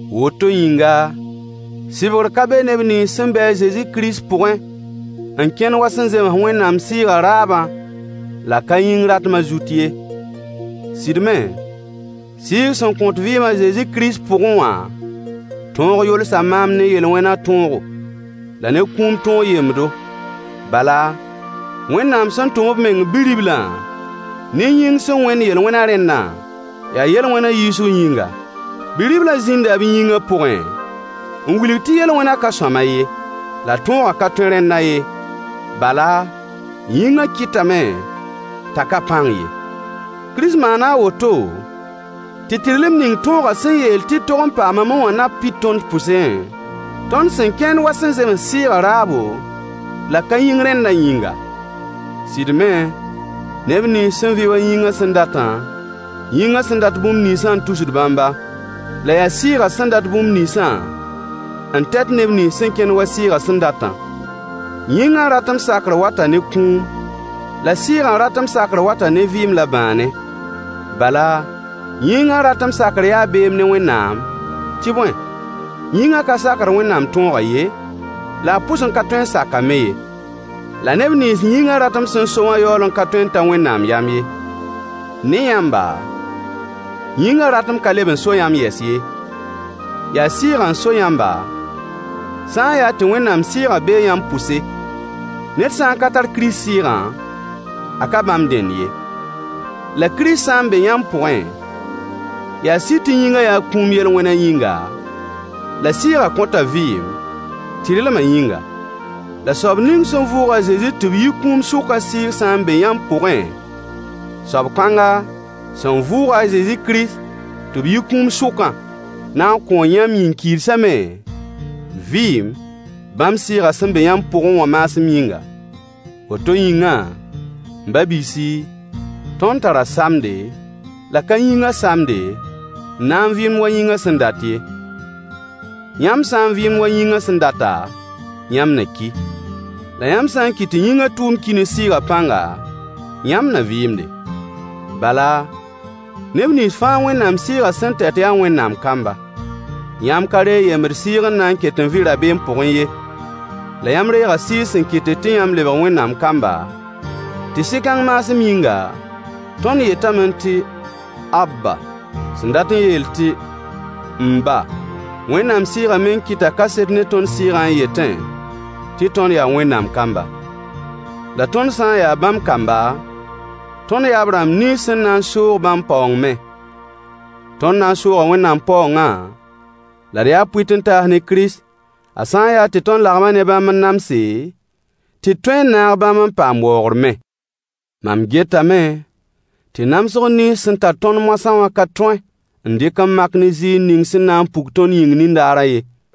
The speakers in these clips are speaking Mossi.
Woto yĩnga, sɩbgr ka be neb nins sẽn be Zezi Kirist pʋgẽ [n kẽnd wa sẽn zems Wẽnnaam Sɩɩgã raabã la ka yĩng ratmã] zut ye. Sɩd me, Sɩɩg sẽn kõt vɩɩm a Zezi Kirist pʋgẽ wã tõog yolsa maam ne yel-wẽnã tõogo, la ne kũum tõog yembdo. Bala, Wẽnnaam sẽn tʋm b meng Bi-riblã ne yĩng sẽn wẽnd yel-wẽnã rẽndã, yaa yel-wẽnã yiisg yĩnga. Bi-riblã zĩnda b yĩngã pʋgẽ n wilg tɩ yel-wẽnã ka sõama ye. La tõogã ka tõe rẽnda ye, bala, yĩngã kɩtame t'a ka pãng ye. Kirist maana a woto tɩ tɩrlem ning tõogã sẽn yeel tɩ d tog n paamame wã na pid tõnd pʋsẽ, tõnd sẽn kẽnd wa sẽn zems Sɩɩgã raabo la ka yĩng rẽndã yĩnga. Sɩd me, neb nins sẽn vɩ wa yĩngã sẽn datã, yĩngã sẽn dat bũmb ninsã n tusd bãmba, la yaa Sɩɩgã sẽn dat bũmb ninsã n tɛt neb nins sẽn kẽnd wa Sɩɩgã sẽn datã. Yĩngã ratem sakr wata ne kũum, la Sɩɩgã ratem sakr wata ne vɩɩm la bãane. Bala, yĩngã ratem sakr yaa beem ne Wẽnnaam, tɩ bõe, yĩngã ka sakd Wẽnnaam tõogã ye, la a pʋs n ka tõe n sak-a me ye. La neb nins yĩngã ratem sẽn so wã yaool n ka tõe n ta Wẽnnaam yam ye. Ne yãmba, yĩngã ratem ka leb n so yãmb yɛs ye, yaa Sɩɩgã n so yãmba, sã n yaa tɩ Wẽnnaam Sɩɩgã bee yãmb pʋse. Ned sã n ka tar Kirist Sɩɩgã, a ka bãmb dẽnd ye. La Kirist sã n be yãmb pʋgẽ, yaa sɩd tɩ yĩngã yaa kũum yel-wẽnã yĩnga, la Sɩɩgã kõta vɩɩm, tɩrlmã yĩnga. La soab ning sẽn vʋʋg a Zezi tɩ b yi kũum sʋkã Sɩɩg sã n be yãmb pʋgẽ, soab kãnga, sẽn vʋʋg-a Kirist Zezi tɩ b yi kũum sʋkã na n kõo yãmb yĩn-kiidsã me vɩɩm, bãmb Sɩɩgã sẽn be yãmb pʋgẽ wã maasem yĩnga. Woto yĩngã, m ba-biisi, tõnd tara samde, la ka yĩngã samde, n na n vɩɩmd wa yĩngã sẽn dat ye. Yãmb sã n vɩɩmd wa yĩngã sẽn data, yãmb na ki. La yãmb sã n kɩt tɩ yĩngã tʋʋm ki ne Sɩɩgã pãnga, yãmb na vɩɩmde. Bala, neb nins fãa Wẽnnaam Sɩɩgã sẽn tɛt yaa Wẽnnaam kamba. Yãmb ka reeg yembd sɩɩg n na n ket n vɩ rabeem pʋgẽ ye. La yãmb reega Sɩɩg sẽn kɩtd tɩ yãmb lebg Wẽnnaam kamba, tɩ Sɩ-kãng maasem yĩnga, tõnd yetame tɩ Abba, sẽn dat n yeel tɩ “m ba.” Wẽnnaam Sɩɩgã meng kɩta kaset ne tõnd sɩɩgã n yetẽ tɩ tõnd yaa Wẽnnaam kamba. La tõnd sã n yaa bãmb kamba, tõnd yaa b rãmb nins sẽn na n soog bãmb paoong me. Tõnd na n sooga Wẽnnaam paoongã, la d yaa pʋɩt-n-taas ne Kirist, a sã n yaa tɩ tõnd lagma ne bãmb n namse, tɩ d tõe n naag bãmb n paam waoogr me. Mam getame tɩ namsg nins sẽn tar tõnd moasã wã ka tõe n dɩk n mak ne ziir ning sẽn na n puk tõnd yĩng nindaarã ye.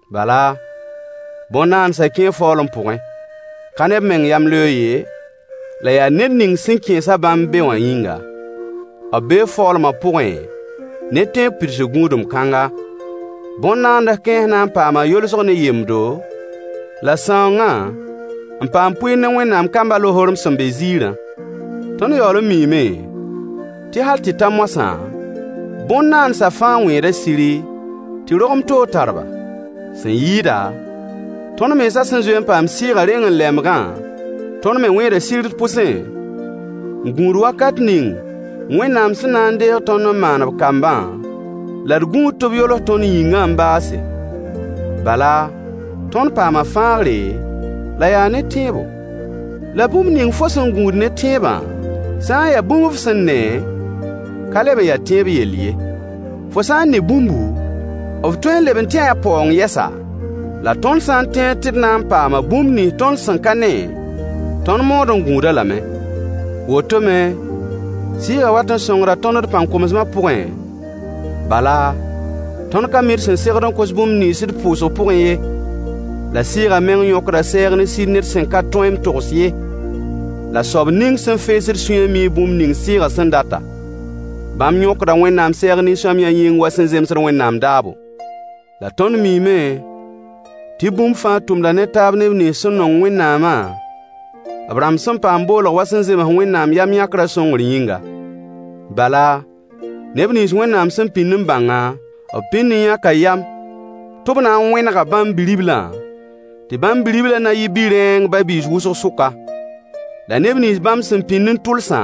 Bala, bõn-naandsã kẽe faoolem pʋgẽ. Ka ne b meng yamleoog ye, la yaa ned ning sẽn kẽes-a bãmb be wã yĩnga. B be faoolmã pʋgẽ ne tẽeb pidsg gũudum kãngã: Bõn-naands kãens na n paama yolsg ne yembdo, la sãoongã, n paam pʋɩɩr ne Wẽnnaam kambã lohorem sẽn be ziirã. Tõnd yaool n miime tɩ hal tɩ ta moasã, bõn-naandsã fãa wẽeda siri, tɩ rogem toog tar-ba. Sẽn yɩɩda, tõnd mensã sẽn zoe n paam Sɩɩgã reng-n-lɛmbgã, tõnd me wẽeda sir d pʋsẽ, n gũud wakat ning Wẽnnaam sẽn na n deeg tõnd n maan b kambã, la d gũud tɩ b yols tõnd yĩngã n baase. Bala, tõnd paama fãagre, la yaa ne tẽebo. La bũmb ning fo sẽn gũud ne tẽebã sã n ya bũmb f sẽn ne, ka leb n ya tẽeb yell ye. Fo sã n ne bũmbu, f tõe n leb n tẽe a paoong yɛsa? La tõnd sã n tẽed tɩ d na n paama bũmb nins tõnd sẽn ka ne, tõnd maood n gũud-a lame. Woto me, Sɩɩgã wat n sõngda tõnd d pãn-komsmã pʋgẽ, bala, tõnd ka mi d sẽn segd n kos bũmb nins d pʋʋsg pʋgẽ ye. La Sɩɩgã meng yõkda sɛɛg ne sir ned sẽn ka tõe n togs ye. La soab ning sẽn feesd sũyã mii bũmb ning Sɩɩgã sẽn data. Bãmb yõkda Wẽnnaam sɛɛg nin-sõamyã yĩng wa sẽn zemsd Wẽnnaam daabo. La tõnd miime tɩ bũmb fãa tʋmda ne taab neb nins sẽn nong Wẽnnaamã, b rãmb sẽn paam boolg wa sẽn zems Wẽnnaam yam-yãkrã sõngr yĩnga. Bala, neb nins Wẽnnaam sẽn pĩnd b bãngã, b pĩnd n yãka yam tɩ b na n wẽnega bãmb Bi-riblã, tɩ bãmb Bi-riblã na yɩ bi-rẽeng ba-biis wʋsg sʋka. La neb nins bãmb sẽn pĩnd n tʋlsã,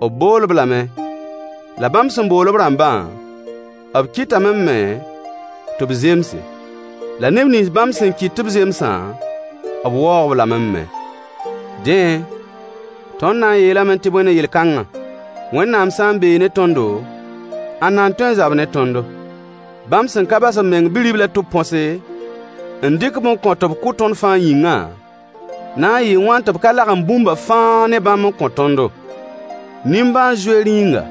b bool-b lame: La bãmb sẽn bool-b rãmbã, b kɩtame me tɩ b zemse. La neb nins bãmb sẽn kɩt tɩ b zemsã, b waoog-b lame me. Dẽ, tõnd na n yeelame tɩ bõe ne yel-kãnga? Wẽnnaam sã n bee ne tõndo, ãnna n tõe n zab ne tõndo? Bãmb sẽn ka bas b meng Bi-riblã tɩ b põse, n dɩk-b n kõ tɩ b kʋ tõnd fãa yĩngã, na n yɩɩ wãn tɩ b ka lagem bũmbã fãa ne bãmb n kõ tõndo, nimbãan-zoeer yĩngã?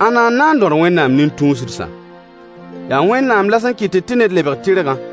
Ãnna n na n dõd Wẽnnaam nin-tũusdsã? Yaa Wẽnnaam la sẽn kɩtd tɩ ned lebg tɩrgã.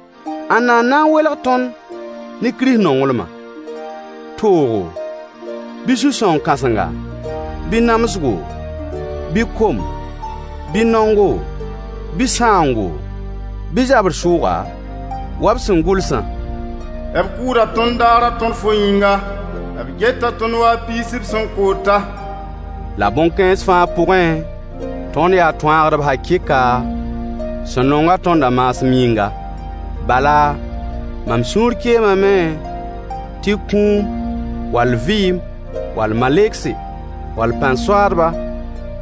Ãnna n na n welg tõnd ne Kirist nonglmã? Toogo, bɩ sũ-sãoong kasenga, bɩ namsgo, bɩ kom, bɩ naongo, bɩ sãoongo, bɩ zabr sʋʋga? Wa b sẽn gʋlsã: B kʋʋda tõnd daarã tõr fo yĩnga. B geta tõnd wa piis b sẽn koota. La bõn-kãens fãa pʋgẽ, tõnd yaa tõaagdb hakɩɩka, sẽn nong-a tõndã maasem yĩnga. Bala, mam sũur keemame tɩ kũum, wall vɩɩm, wall malegse, wall pãn-soaadba,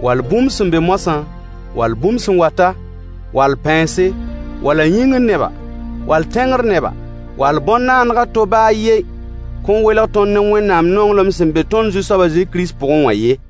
wall bũmb sẽn be moasã, wall bũmb sẽn wata, wall pãense, wall yĩngr neba, wall tẽngr neba, wall bõn-naandg a to baa a yen kõn n welg tõnd ne Wẽnnaam nonglem sẽn be tõnd Zu-soab a Kirist Zezi pʋgẽ wã ye.